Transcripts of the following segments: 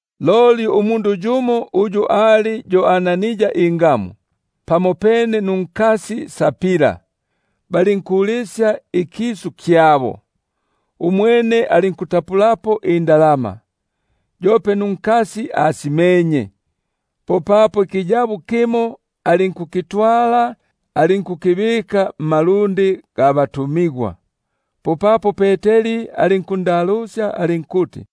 Loli umundu yumo uyu ali yo Anania ingamu, pamopene nunkasi Safira, balinkulisya ikisu kyabo. Umwene alinkutapulako indalama, yope nunkasi asimenye; popapo ikiyabo kimo alinkukitwala, alinkukibika mmalundi ga batu- migwa. Popapo Peteri alinkumbula alinkuti: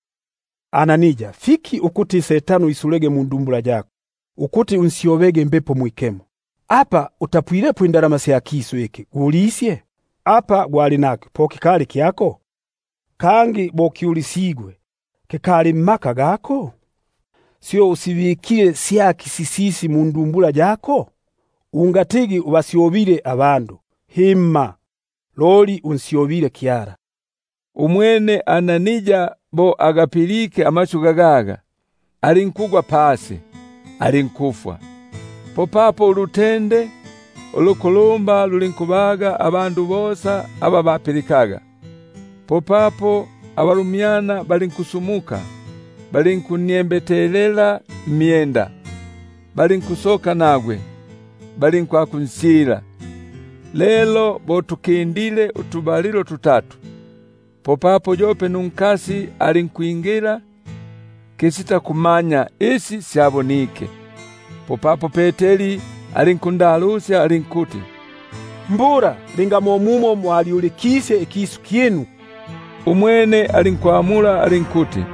Anania, fiki Setano iswile mundumbula yako, ukuti unsyobege Mbepo Mwikemo, apa kutapulako indalama sya kisu iki gulisyaga? Apa gwali nakyo po kikali kyako? Kangi bo kyulisigwe, kikali mmaka gako? Syo usibikile syaki sisisi mundumbula yako? Ungatigi ubasyobile abandu, himma, loli unsyobile Kyala. Umwene Anania bo agapilike amasyu gagaga, alinkugwa pasi, alinkufwa. Popapo ulutende ulukulumba lulinkubaga bosa aba bapilikaga. Popapo abalumyana balinkusumuka, balinkunniembetelela mmyenda, balinkusoka nagwe, balinkwakunsyila. Lelo bo tukindile utubalilo tutatu, popapo yope unkasi alinkwingila kisitakumanya isi syabonike. Popapo Peteri alinkundalusya alinkuti: Mbula linga mo mumo mwalyuli- kisye ikisu kyinu? Umwene alinkuti: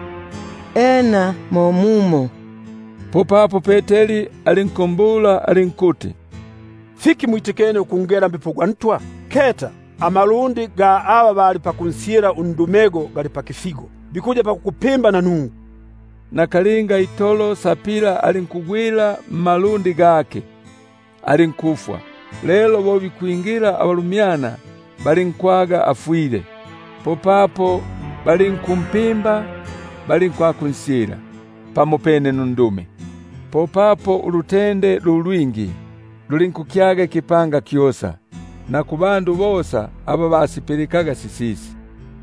Ena mo mumo. Popapo Peteri alinkumbula alinkuti: Fiki mwitikene ukungela Mbepo gwa Ntwa? Keta amalundi ga aba bali pakunsyila undumego gali pakifigo, bikuya pakukupimba nanungwe. Nakalinga itolo alinkungwila mmalundi, alinkufwa; lelo bo bikwingila abalumyana, balinkwaga afwile. Popapo balinku- mpimba balinkwakunsyila pamopene nundume. Popapo ulutende lu lwingi lulinkukyaga ikipanga kyosa, na kuli bosa aba basipilikaga sisisi.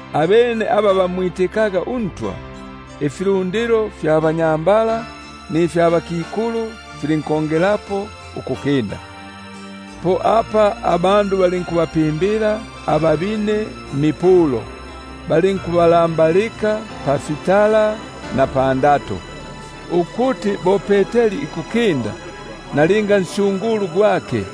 Abene aba bamwitikaga uNtwa, ifilundilo ifya banyambala nifya bakikulu filinkongelelapo ukukinda; po apa balinkubapimbila ababine mmipulo, balinkubalambalika pafitala na pandato, ukuti bo Peteri ikukinda, nalinga nsyungulu gwake,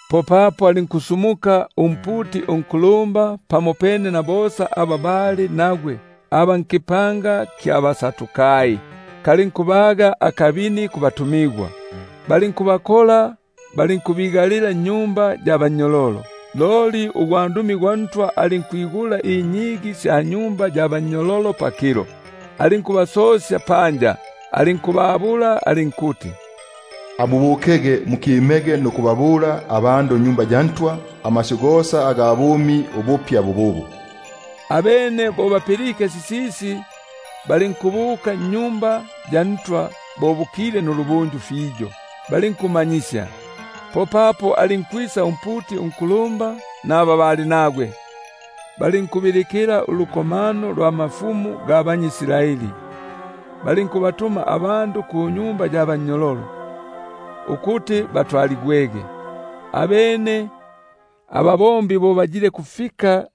Popapo alinkusumuka umputi unkulumba pamopene na bosa aba bali nagwe (aba nkapanga ka baSadukai), kalinkubaga akabini, balinkubakola abatumigwa, balinkubigalila nnyumba ya bannyololo. Loli ugwandumi gwa Ntwa alinkwigula inyigi sya nyumba ya bannyololo pakilo, alinkubasosya panja, alinkubabula alinkuti: Amubukege mukimege nikubabula abandu mwa Tempeli amasyu gosa aga bumi bububu. Abene bo bapilike sisisi, balinkubuka mwa Tempeli bo bukukya balinkumanyisya. Popapo alinkwisa umputi unkulumba naba bali nagwe, balinkubilikila ulukomano lwa bakulumba ba banyʼIsraeli, balinkutuma indumi kunyumba ya bannyololo, ukuti batwa- ligwege. Abene ababombi bo bayilekufika,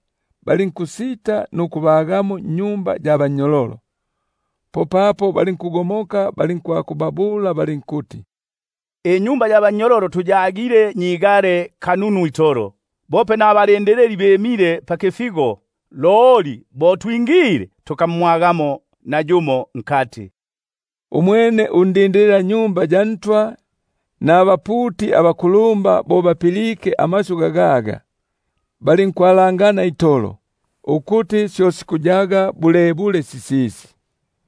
balinkusita nukubaga munyumba ya bannyololo, popapo balinkugomoka, balinkubabula balinkuti: Inyumba ya bannyololo tuyagile nyigale kanunu itolo, bope mbalindilili bimile pafifigo, loli bo twigwileko, tukamwagamo nayumo nkati. Umwene undindilila-Tempeli nabaputi abakulumba bo bapilike amasyu gagaga, balinkwalangana itolo, ukuti syo sikuyaga bulebule sisisi.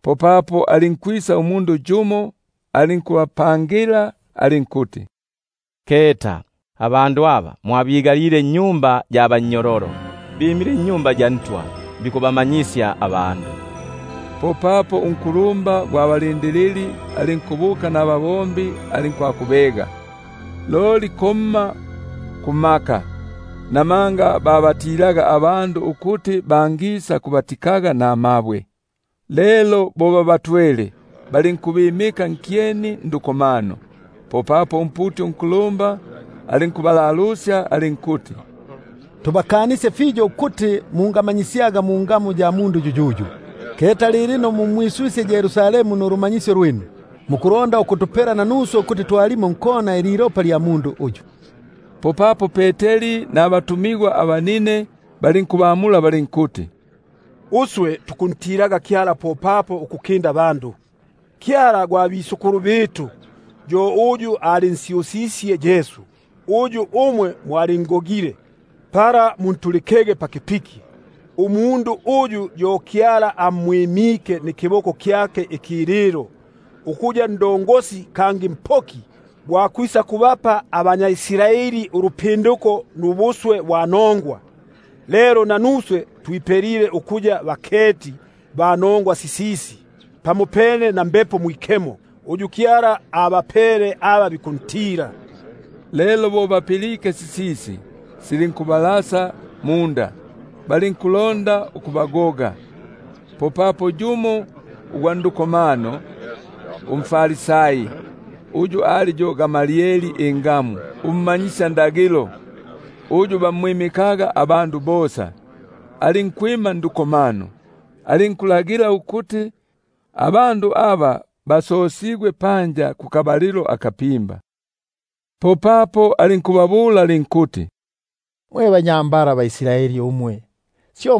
Popapo alinkwisa umundu yumo alinkubapangila alinkuti: Keta, abandu aba mwabigalile nnyumba ya bannyololo, bimile mwa Tempeli bkubamanyisya abandu. Popapo undindilili alinkubuka nababombi alinkwakubega, loli komma kumaka, namanga babatilaga abandu ukuti bangisakubatikaga namabwe. Lelo bo babatwele, balinkubimika nkyeni nduko- mano. Popapo umputi unkulumba alinkubalalusya alinkuti: Tubakanisye fiyo ukuti mungamanyikisyaga mungamu yiyiyi, keta lilino mumwiswisye Yerusalemu nulumanyisyo lwinu, mukulonda ukutwala ilopa lya mundu uyu pamyitu. Popapo Peteri nabatumigwa balinkubamula balinkuti: Umundu fikuti antilege Kyala ukukinda abandu. Kyala gwa batata alinsyusisye Yesu, uyu umwe mwalingogile, pala muntulikege paki- piki; umundu uyu, yo uyu Kyala amwimke nikiboko kyake ikililo, ukuya Ndongosi, kangi Mpoki gwa kwisakubapa abanyʼIsraeli ulupinduko, nubuswe bwa nongwa. Lelo nanuswe twipelile ukuya baketi ba nongwa sisisi, pamopene na Mbepo Mwikemo, uyu Kyala abapele aba bikumpilika. Lelo bo bapilke sisisi, popapo silinkubalasa munda, balinku- londa ukubagoga. Popapo yumo ugwa ndukomano, umFarisai, uyu ali yo Gamalieli ingamu, ummanyisyandagilo uyu bamwimikaga abandu bosa, alinkwima ndukomano, alinkulagila ukuti abandu aba basosigwe panja kukabalilo akanandi, alinkubabula alinkuti: Mwe banyambala mwe baIsraeli, syo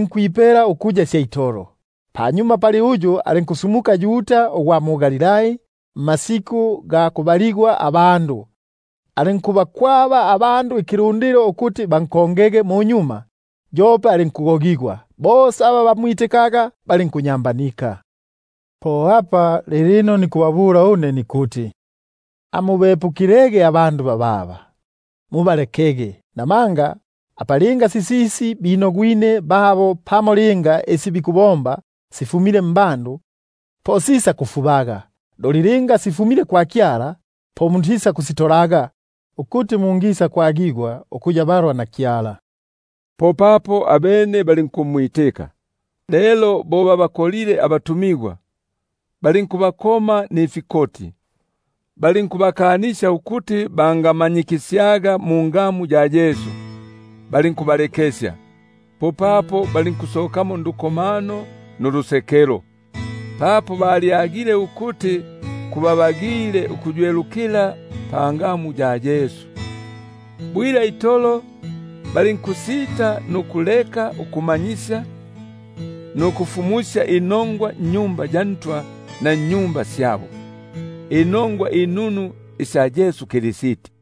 nkwipela ukuya sya itolo. Panyuma pali uyu alinkusumuka Yuda ugwa mu-Galilai, mmasiku ga kubaligwa abandu, alinkubakwaba abandu ikilundilo ukuti bankongege munyuma; yope alinkufwa, kangi bosa aba bamwitikaga balinkunyamba- nika. Po apa lilino nikubabula une nikuti: Amubepukilege abandu bababa, mubalekege; buno isi linga binogwine, pamo isi bikubomba sifumile mbandu, po sisakufubaga; loli linga sifumile kwa Kyala, po mutisakusitolaga, ukuti mungisakwa- gigwa ukuya balwa na Kyala. Abene balinkumwitika. Lelo bo babakolile abatumigwa, balinkubakoma, balinkubakanisya ukuti bangayobelaga mungamu ya Yesu; balinkubalekesya. Popapo balinkusokamo ndukomano nulusekelo, papo balyagile ukuti kubabagile ukuywelukila pangamu ya Yesu. Bwila itolo balinkusita nukuleka ukumanyisya nukufumusya inongwa mwa Tempeli na nnyumba syabo, inongwa inunu isya Yesu ukuya yo Kristi.